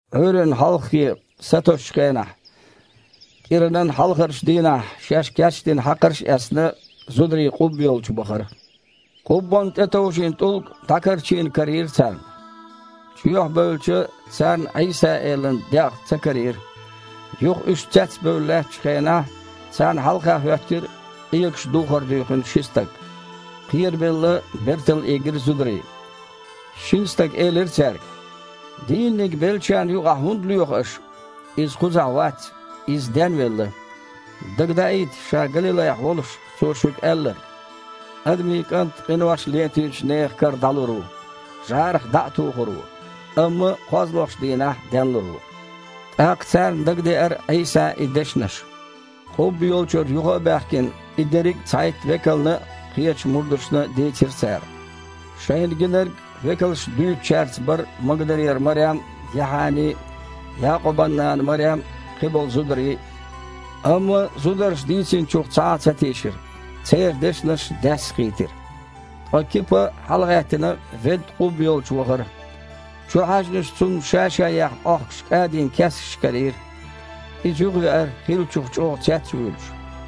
Іуьйранна хьалххе, сатосучу хенахь, кІиранан хьалхарчу дийнахь, шаьш кечдина хьакхарш а эцна, зударий къубба йолчу бахара. Къуббанна тІетовжийна тІулг дІакарчийна карийра царна. Чоьхьа бевлча, царна Іийса-Элан дегІ ца карийра. Юха, уьш цецбевлла лаьттачу хенахь, царна хьалха хІоьттира къегаш духар дуьйхина ши стаг. Кхерабелла, бертал ийгира зударий. Шина стага элира цаьрга: «Дийнаниг беллачарна юкъахь хІунда лоьху аш? Иза кхузахь вац, Иза денвелла! Дагадаийта Ша Галилайхь волуш Цо шуьга аьлларг: „ Адамийн КІант къинош летийначу нехан кара дІалур ву, жІарах дІа а тухур ву, амма кхозлагІчу дийнахь денлур ву“». ТІаккха царна дагадеара Іийсан и дешнаш. Къубба йолчуьра юха а баьхкина, и дерриг цхьайтта векална а, кхечу мурдашна а дийцира цара. Шайна гинарг векалшна дуьйцучаьрца бара Магдалера Марем а, Яхьани а, Якъубан нана Марем а, кхиболу зударий а. Амма зударша дийцинчух цхьа а ца тийшира. Церан дешнаш даьсса хийтира. Ткъа Кипа, хьалагІаьттина, ведда къубба йолчу вахара. Чухьаьжначу цунна ша-ша яьхна Іохкуш кІадинан кескаш карийра. Иза юхавеара, хиллачух чІогІа цец а вуьйлуш.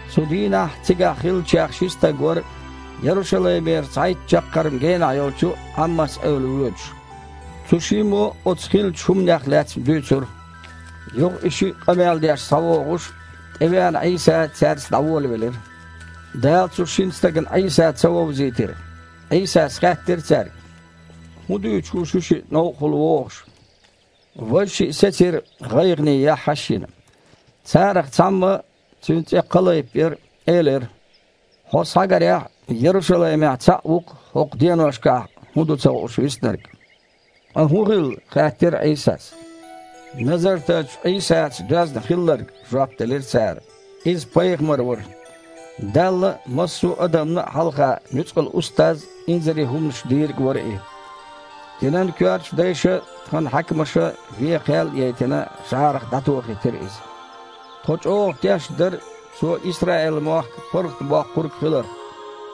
Цу дийнахь цигахь хиллачех ши стаг вара Ярушалаймера цхьайтта чаккхарма генахь йолчу Іаммас-эвла воьдуш. Цу шиммо оцу хиллачу хІуманех лаьцна дуьйцура. Юха и шиъ къамел деш схьавогІуш, тІевеана Іийса цаьрца дІаволавелира. Дала цу шина стагана Іийса ца вовзийтира. Іийсас хаьттира цаьрга: «ХІун дуьйцуш ву шуьшиъ новкъахула вогІуш?» Важа шиъ сецира, гІайгІане яххьаш а йина. Царах цхьамма, цуьнан цІе Кхалайп яра, элира: «Хьо, схьагарехь, Ярушалаймехь цхьаъ ву-кх хІокху деношкахь хІун ду ца хууш виснарг?» «Ткъа хІун хилла?» – хаьттира Іийсас. «Назартарчу Іийсаца доьзна хилларг, – жоп делира цара. – Иза пайхамар вара. Далла а, массо адамна а хьалха нуьцкъала Устаз а, инзаре хІуманаш Дийриг вара И. Динан коьртачу дайша а, тхан хьаькамаша а вен кхел а яйтина, жІарах дІатохийтира Иза. Тхо чІогІа тешна дара Цо Исраил-мохк ПаргІатбоккхург хиларх.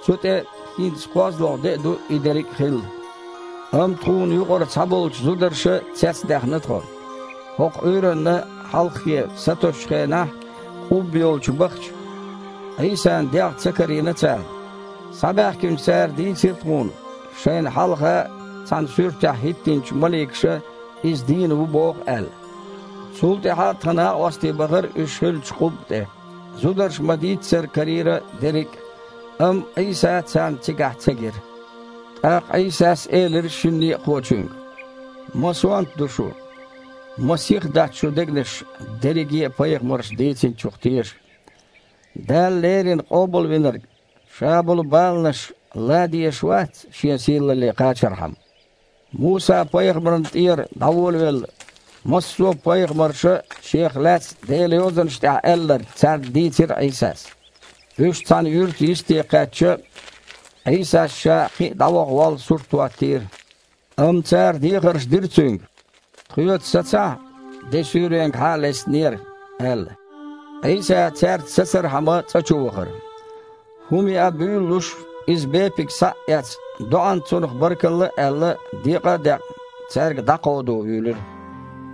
Цу тІе, хІинца кхозлагІа де а ду и дерриг а хилла. Амма тхуна юкъара цхьаболчу зударша цецдаьхна тхо. ХІокху Іуьйранна хьалххе, сатосучу хенахь, къубба йолчу бахача, Іийсан дегІ ца карийра царна. Схьабаьхкинчу цара дийцира тхуна, шайна хьалха цхьана суьртехь хІиттинчу маликаша Иза дийна ву боху аьлла. Цул тІаьхьа тхан накъостий бахара уьш хиллачу къубба тІе, зударша ма-дийццара карийра дерриг а, амма Іийса царна цигахь ца гира». ТІаккха Іийсас элира шина некъахочуьнга: «Ма сонта ду шу! Ма сиха дац шун дегнаш дерриге а пайхамарша дийцинчух теша! Дала Леррина Къобалвинарг Ша болу баланаш лан дезаш вац, Шен сийлалле кхачархьама?» Муса-пайхамарна тІера дІаволавелла, массо а пайхамарша Шех лаьцна Делан Йозанаш тІехь аьлларг царна дийцира Іийсас. Уьш цхьана юьрта йисте кхаьчча, Іийсас Ша кхин а дІаваха воллу сурт хІоттийра. Амма цара дехарш дира Цуьнга: «Тхоьца сацахьа, де суьйренгахьа а лестинера», – аьлла. Іийса цаьрца сацархьама цІа чу вахара. ХІума яа буьйлалуш Иза бепиг, схьа а эцна, доІанца цунах баркалла а аьлла, декъа а декъна, цаьрга дІакховдо вуьйлира.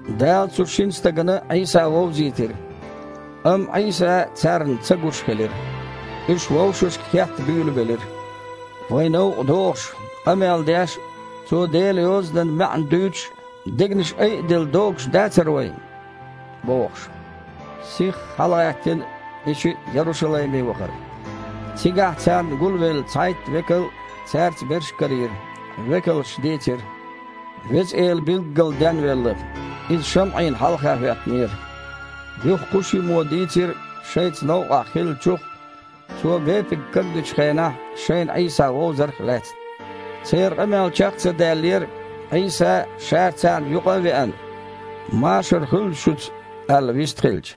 Дала цу шина стагана Іийса вовзийтира. Амма Іийса царна ца гуш хилира. Уьш вовшашка хетта буьйлабелира: «Вай новкъа догІуш, къамел деш а, Цо Делан Йозанан маьІна дуьйцуш а дегнаш айаделла догуш дацара вайн?» – бохуш. Сихха хьалагІаьттина, и шиъ Ярушалайме вахара. Цигахь царна гулвелла цхьайтта векал а, цаьрца берш а карийра. Векалша дийцира: «Веза Эла билггала денвелла! Иза ШамІина хьалха хІоьттинера!» Юха кху шиммо дийцира шайца новкъахь хиллачух а, Цо бепиг кагдечу хенахь, шайна Іийса вовзарх а лаьцна. Церан къамел чекх а ца даьллера, Іийса, Ша царна юкъа а веана: «Машар хуьлда шуьца», – аьлла, вистхилча.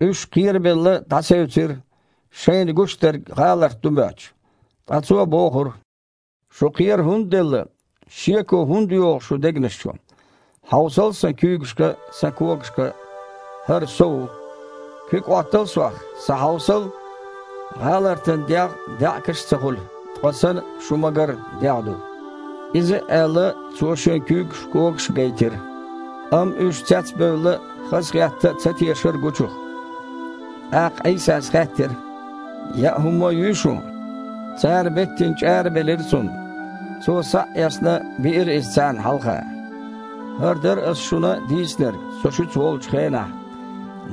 Уьш, кхерабелла, дІасевцира, шайна гуш дерг гІаларт ду моьттуш. Ткъа Цо бохура: «Шу кхера хІунда делла? Шеко хІунда йогІу шу дегнаш чу? Хьовсал Сан куьйгашка а, Сан когашка а. ХІара Со ву! Куьг Іоттал Сох, схьахьовсал. ГІалартан дегІ а, даьІахкаш а ца хуьлу, ткъа Сан, шуна ма-гарра, дегІ ду». Иза а аьлла, Цо Шен куьйгаш а, когаш а гайтира. Амма уьш цецбевлла а, хазахетта а ца тешара гучух. ТІаккха Іийсас хаьттира: «Яа хІумма а юй шун?» Цара беттина чІара белира Цунна. Цо, схьа а эцна, биира иза царна хьалха. «ХІара дара Ас шуна дийцинарг Со шуьца волчу хенахь,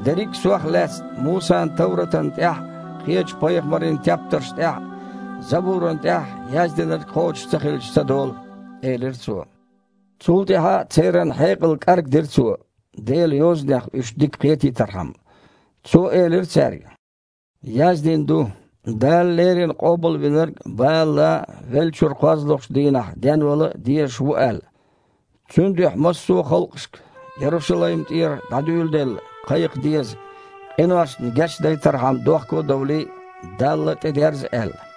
дерриг а Сох лаьцна Мусан товратана тІехь а, кхечу пайхамарийн тептарш тІехь а, Забурана тІехь а яздинарг кхочуш ца хилча ца долу», – элира Цо. Цул тІаьхьа церан хьекъал кІаргдира Цо, Делан Йозанах уьш дика кхетийтархьама. Цо элира цаьрга: «Яздина ду, Дала Леррина Къобалвинарг бала лан а, веллачуьра кхозлагІчу дийнахь денвала дезаш а ву аьлла. Цуьнан дуьхьа массо а халкъашка, Ярушалайм тІера дІадуьйладелла, кхайкха деза, къиношна гечдайтархьама дохко а довлий, Далла тІедерза аьлла.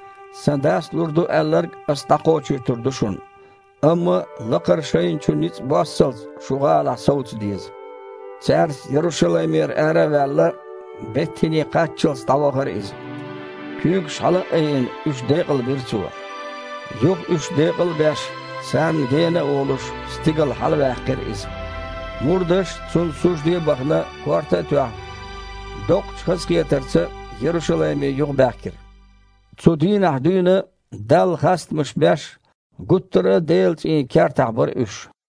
Сан Дас лур ду аьлларг Ас дІакхочуьйтур ду шуна, амма, лакхара шайна чу ницкъ боссалц, шу гІалахь совца деза». Цаьрца Ярушалаймера ара а ваьлла, Бет-ХІине кхаччалц дІавахара Иза. Куьйгаш хьала а айина, уьш декъалбира Цо. Юха, уьш декъал а беш, царна гена а волуш, стигала хьалаваьккхира Иза. Мурдаш, Цунна сужде а бахана, корта а тоьхна, доккхачу хазахетарца Ярушалайме юхабаьхкира. Цу дийнахь дуьйна, Далла хастамаш беш, гуттар а Делан цІийнан кертахь бара уьш.